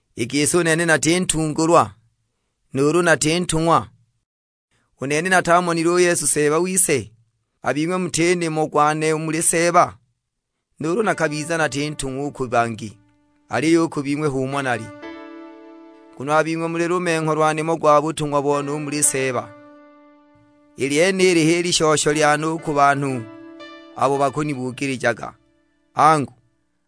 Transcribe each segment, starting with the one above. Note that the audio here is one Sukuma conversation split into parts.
I gisi u nene nati ntungulwa? Nuulu nati ntung'wa? U nene natamonile u Yesu Seeba wise? A bing'we muti nimo gwane u muli Seeba? Nuulu nakabiza nati ntung'wa u ku bangi, aliyo u ku bing'we h'umo nali, nguno a bing'we muli lumengho lwa nimo gwa butung'wa bone u muli Seeba. I lyenili h'i lishosho lyane u ku banhu abo bakunibugilijaga. Angu,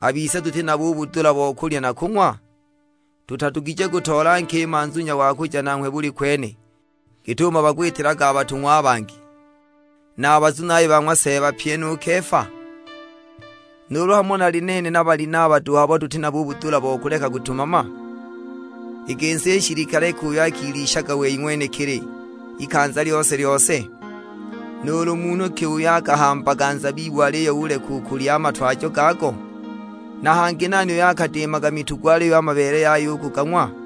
a bise tuti nabo u budula bo kulya na kung'wa? Tutadugije kutoola nkima nzunya wa kuja nanghwe buli kwene, git'umo bakwitilaga a batung'wa a bangi, na a bazunaye ba ng'wa Seeba, pyi nu Kefa? Nuulu hamo nali nene na Balinaba duhu abo tuti nabo u budula bo kuleka kutumama? I gisi nshilikale ki uyo akilishaga wei ng'wenekili ikanza lyose-lyose? Nuulu munhu ki uyo akahambaga nzabibu aliyo uleka u kulya a matwajo gago? Na hangi nani uyo akadiimaga mitugo aliyo a mabeele yaya u kugang'wa?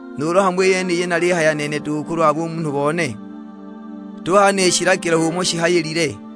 Nuulu hamo i yeniyi nalihayila nene duhu kulwa bumunhu bone? Tuhaya ni shilagilo h'umo shihayilile?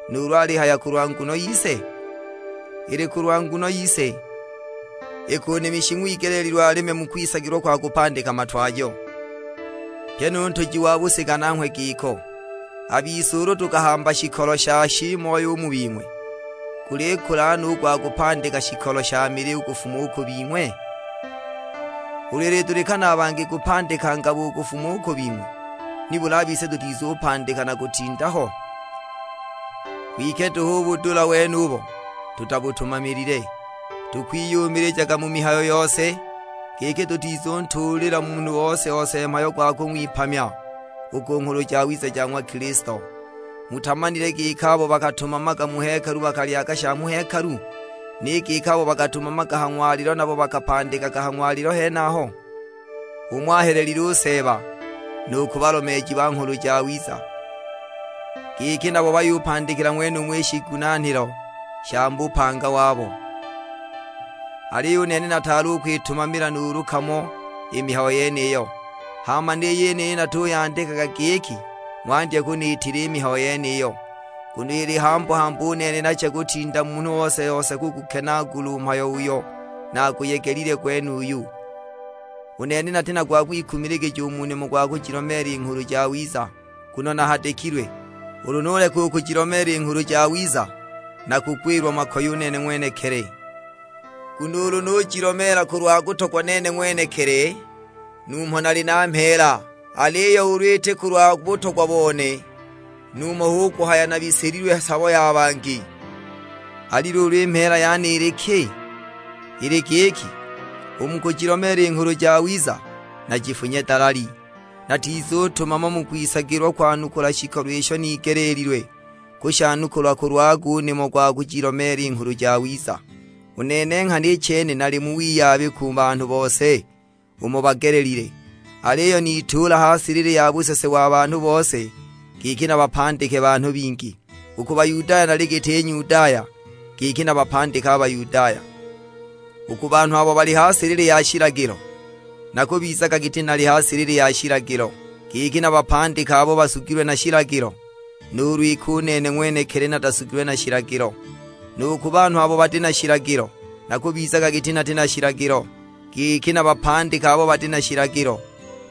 nuulu alihaya kulwa nguno yise? Ili kulwa nguno yise, iki u nimi shing'wigeleelilwe alime mu kwisagilwa kwa kupandika matwajo; pyi nu ntuji wa busiga nanghwe giko. A bise ulu tukahamba shikolo sha shiimoyo u mu bing'we, gulikula no u gwa kupandika shikolo sha mili u kufuma u ku bing'we? Ulu ilidulikana a bangi kupandika ngabo u kufuma u ku bing'we, nibuli a bise tutizupandika na kutinda ho? Kwike duhu u budula wenubo tutabutumamilile, tukwiyumilijaga mu mihayo yose, giki tutizuntuulila munhu ose-ose mhayo gwa kung'wipamya u ku Nghulu Jawiza ja ng'wa Kilisto. Mutamanile giki abo bakatumamaga mu hekalu bakalyaga sha mu hekalu? Ni giki abo bakatumamaga ha ng'walilo nabo bakapandikilaga ha ng'walilo henaho? H'umo ahelelile u Seeba nu ku balomeeji ba Nghulu Jawiza, giki nabo bayupandikila ng'wenumo i shiigunaanilo sha mu bupanga wabo. Aliyo u nene nataali u kwitumamila nuulu kamo i mihayo yeniyo. Hama ni yeniyi natuyandikaga giki ng'wandye kuniitila i mihayo yeniyo, nguno ili hambu-hambu u nene nache kutinda munhu ose-ose kugukenaagula u mhayo uyo naguyegelile gwenuyu. U nene nati na gwa kwikumiligija u mu nimo gwa kujilomeela i Nghulu Jawiza; nguno nahadikilwe. Ulu nuleka u kujilomeela i Nghulu Jawiza nakugwilwa makoye u nene ng'wenekili! Nguno ulu nujilomeela kulwa kutogwa nene ng'wenekili numho nali na mheela, aliyo ulu iti kulwa butogwa bone, numho hu kuhaya nabilisililwe sabo ya bangi. Ali luulu i mheela yane ili ki? Ili giki, u mu kujilomeela i Nghulu Jawiza najifunye dalali, natizutumama mu kwisagilwa kwanukula shikolo isho nigeleelilwe kushanukula kulwago u nimo gwa kujilomeela i Nghulu Jawiza. U nene nghana i chene nali mu wiyabi ku banhu bose umo bagelelile, aliyo nituula ha silili ya busese wa banhu bose, giki nabapandike banhu bingi. U ku Bayudaya nali giti Nyudaya, giki nabapandike a Bayudaya. U ku banhu abo bali ha silili ya shilagilo, nakubizaga giti nali ha silili ya shilagilo, giki nabapandike abo basugilwe na shilagilo; (nuulu iki u nene ng'wenekili natasugilwe na shilagilo). Nu ku banhu abo bati na shilagilo, nakubizaga giti nati na shilagilo, giki nabapandike abo bati na shilagilo,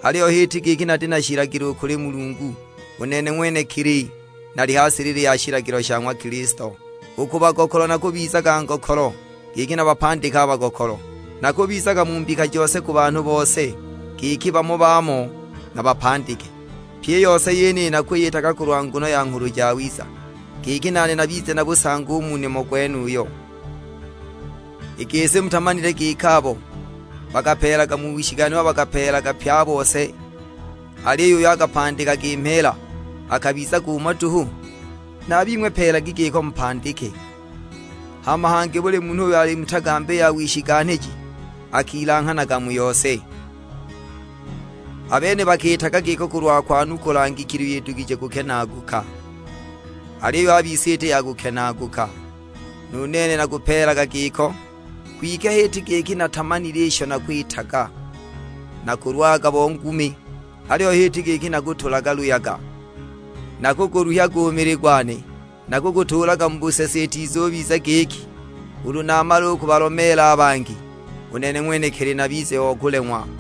(aliyo h'iti giki nati na shilagilo u kuli Mulungu, u nene ng'wenekili nali ha silili ya shilagilo sha ng'wa Kilisto). U ku bagokolo nakubizaga ngokolo, giki nabapandike a bagokolo; nakubizaga mu mbika jose ku banhu bose, giki bamo na bamo nabapandike. Pyi i yose yeniyi nakwiyitaga kulwa nguno ya Nghulu Jawiza, giki nane nabize na busangi u mu nimo gwenuyo. I gisi mutamanile giki abo bakapeelaga mu wishiganhilwa bakapeelaga pye a bose, aliyo uyo akapandikaga mheela akabizaga umo duhu? Na a bing'we peelagi giko mupandike. Hama hangi buli munhu uyo ali mu tagambi ya wishiganhiji akilanghanaga mu yose. A bene bakiitaga giko kulwa kwanukula ngikili iyo idugije kukenaaguka; aliyo a bise iti ya kukenaaguka. Nu nene nakupeelaga giko, kwike h'iti giki natamanile isho nakwitaga; nakulwaga bo ngumi, aliyo h'iti giki nakutulaga luyaga. Nakuguluhyaga u mili gwane, nakugutuulaga mu busese itizubiza giki, ulu namala u kubalomeela a bangi, u nene ng'wenekili nabize o kuleng'wa.